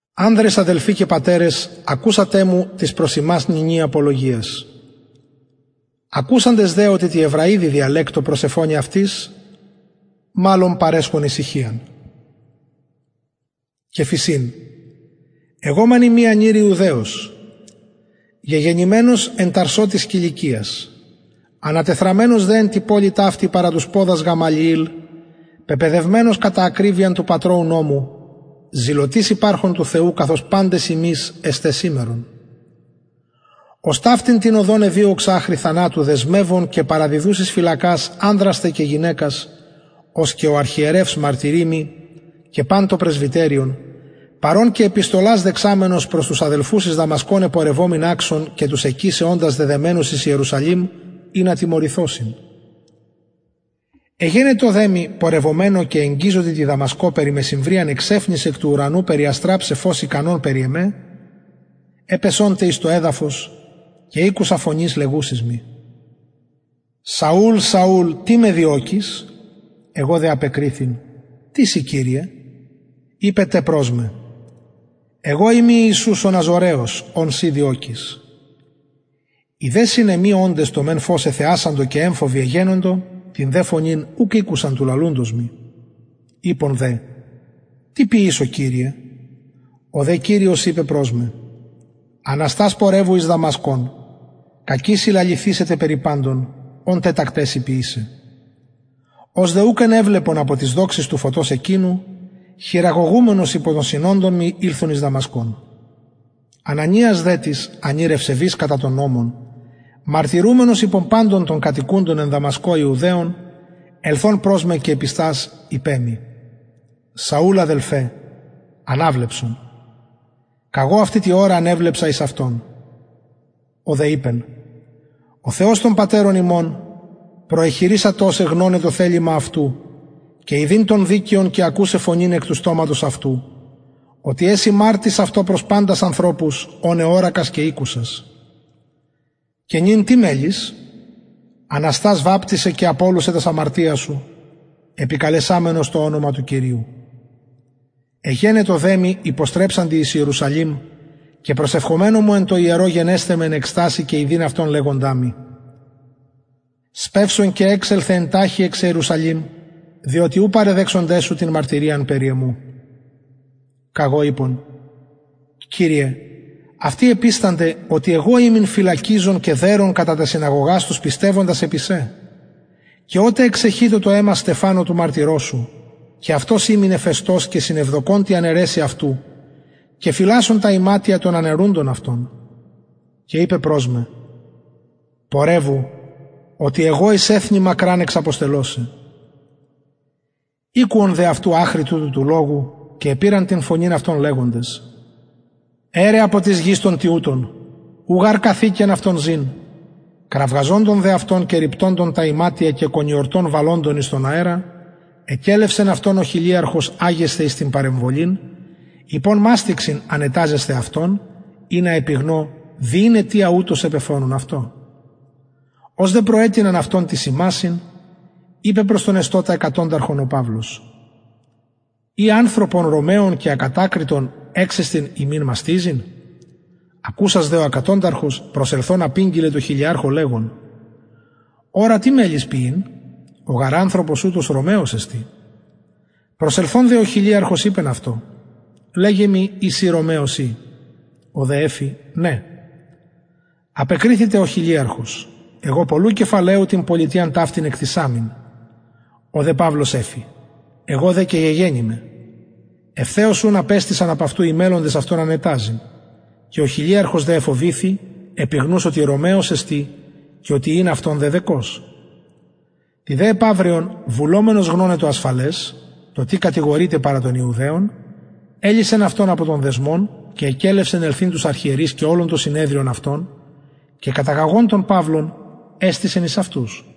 ανδρες αδελφοι και πατερες ακουσατε μου της προς υμας νυνι απολογιας ακουσαντες δε οτι τη εβραιδι διαλεκτω προσεφωνει αυτοις μαλλον παρεσχον ησυχιαν και φησιν εγω μεν ειμι ανηρ ιουδαιος γεγεννημενος εν ταρσω της κιλικιας ανατεθραμμενος δε εν τη πολει ταυτη παρα τους ποδας γαμαλιηλ πεπαιδευμενος κατα ακριβειαν του πατρωου νομου ζηλωτης υπαρχων του θεου καθως παντες υμεις εστε σημερον ος ταυτην την οδον εδιωξα αχρι θανατου δεσμευων και παραδιδους εις φυλακας ανδρας τε και γυναικας ως και ο αρχιερευς μαρτυρει μοι και παν το πρεσβυτεριον παρ ων και επιστολας δεξαμενος προς τους αδελφους εις δαμασκον επορευομην αξων και τους εκεισε οντας δεδεμενους εις ιερουσαλημ ινα τιμωρηθωσιν εγενετο δε μοι πορευομενω και εγγιζοντι τη δαμασκω περι μεσημβριαν εξαιφνης εκ του ουρανου περιαστραψαι φως ικανον περι εμε επεσα τε εις το εδαφος και ηκουσα φωνης λεγουσης μοι σαουλ σαουλ τι με διωκεις εγω δε απεκριθην τις ει κυριε ειπεν τε προς με εγω ειμι ιησους ο ναζωραιος ον συ διωκεις οι δε συν εμοι οντες το μεν φως εθεασαντο και εμφοβοι εγενοντο την δε φωνην ουκ ηκουσαν του λαλουντος μοι ειπον δε τι ποιησω κυριε ο δε κυριος ειπεν προς με αναστας πορευου εις δαμασκον κακει σοι λαληθησεται περι παντων ων τετακται σοι ποιησαι ως δε ουκ ενεβλεπον απο της δοξης του φωτος εκεινου χειραγωγουμενος υπο των συνοντων μοι ηλθον εις δαμασκον ανανιας δε τις ανηρ ευσεβης κατα τον νομον μαρτυρουμενος υπο παντων των κατοικουντων ιουδαιων ελθων προς με και επιστας ειπεν μοι σαουλ αδελφε αναβλεψον καγω αυτη τη ωρα ανεβλεψα εις αυτον ο δε ειπεν ο θεος των πατερων ημων προεχειρισατο σε γνωναι το θελημα αυτου και ιδειν τον δικαιον και ακουσαι φωνην εκ του στοματος αυτου οτι εση μαρτυς αυτω προς παντας ανθρωπους ων εωρακας και ηκουσας και νυν τι μελλεις αναστας βαπτισαι και απολουσαι τας αμαρτιας σου επικαλεσαμενος το ονομα του κυριου εγενετο δε μοι υποστρεψαντι εις ιερουσαλημ και προσευχομενου μου εν τω ιερω γενεσθαι με εν εκστασει και ιδειν αυτον λεγοντα μοι σπευσον και εξελθε εν ταχει εξ ιερουσαλημ διοτι ου παραδεξονται σου την μαρτυριαν περι εμου καγω ειπον κυριε αυτοι επιστανται οτι εγω ημην φυλακιζων και δερων κατα τας συναγωγας τους πιστευοντας επι σε και οτε εξεχειτο το αιμα στεφανου του μαρτυρος σου και αυτος ημην εφεστως και συνευδοκων τη αναιρεσει αυτου φυλασσων τα ιματια των αναιρουντων αυτον και ειπεν προς με πορευου οτι εγω εις εθνη μακραν εξαποστελω σε ηκουον δε αυτου αχρι τουτου του λογου και επηραν την φωνην αυτων λεγοντες αιρε απο της γης τον τοιουτον ου γαρ καθηκεν αυτον ζην κραζοντων δε αυτων και ριπτουντων τα ιματια και κονιορτον βαλλοντων εις τον αερα εκελευσεν αυτον ο χιλιαρχος αγεσθαι εις την παρεμβολην ειπων μαστιξιν ανεταζεσθαι αυτον ινα επιγνω δι ην αιτιαν ουτως επεφωνουν αυτω ως δε προετεινεν αυτον τοις ιμασιν ειπεν προς τον εστωτα εκατονταρχον ο παυλος ει ανθρωπον ρωμαιον και ακατακριτον εξεστιν υμιν μαστιζειν ακουσας δε ο εκατονταρχος προσελθων απηγγειλεν τω χιλιαρχω λεγων ορα τι μελλεις ποιειν ο γαρ ανθρωπος ουτος ρωμαιος εστιν προσελθων δε ο χιλιαρχος ειπεν αυτω λεγε μοι ει συ ρωμαιος ει ο δε εφη ναι απεκριθη τε ο χιλιαρχος εγω πολλου κεφαλαιου την πολιτειαν ταυτην εκτησαμην ο δε παυλος εφη εγω δε και γεγεννημαι ευθεως ουν απεστησαν απ αυτου οι μελλοντες αυτον ανεταζειν και ο χιλιαρχος δε εφοβηθη επιγνους οτι ρωμαιος εστιν και οτι ην αυτον δεδεκως τη δε επαυριον βουλομενος γνωναι το ασφαλες το τι κατηγορειται παρα των ιουδαιων ελυσεν αυτον απο των δεσμων και εκελευσεν ελθειν τους αρχιερεις και ολον το συνεδριον αυτων και καταγαγων τον παυλον εστησεν εις αυτους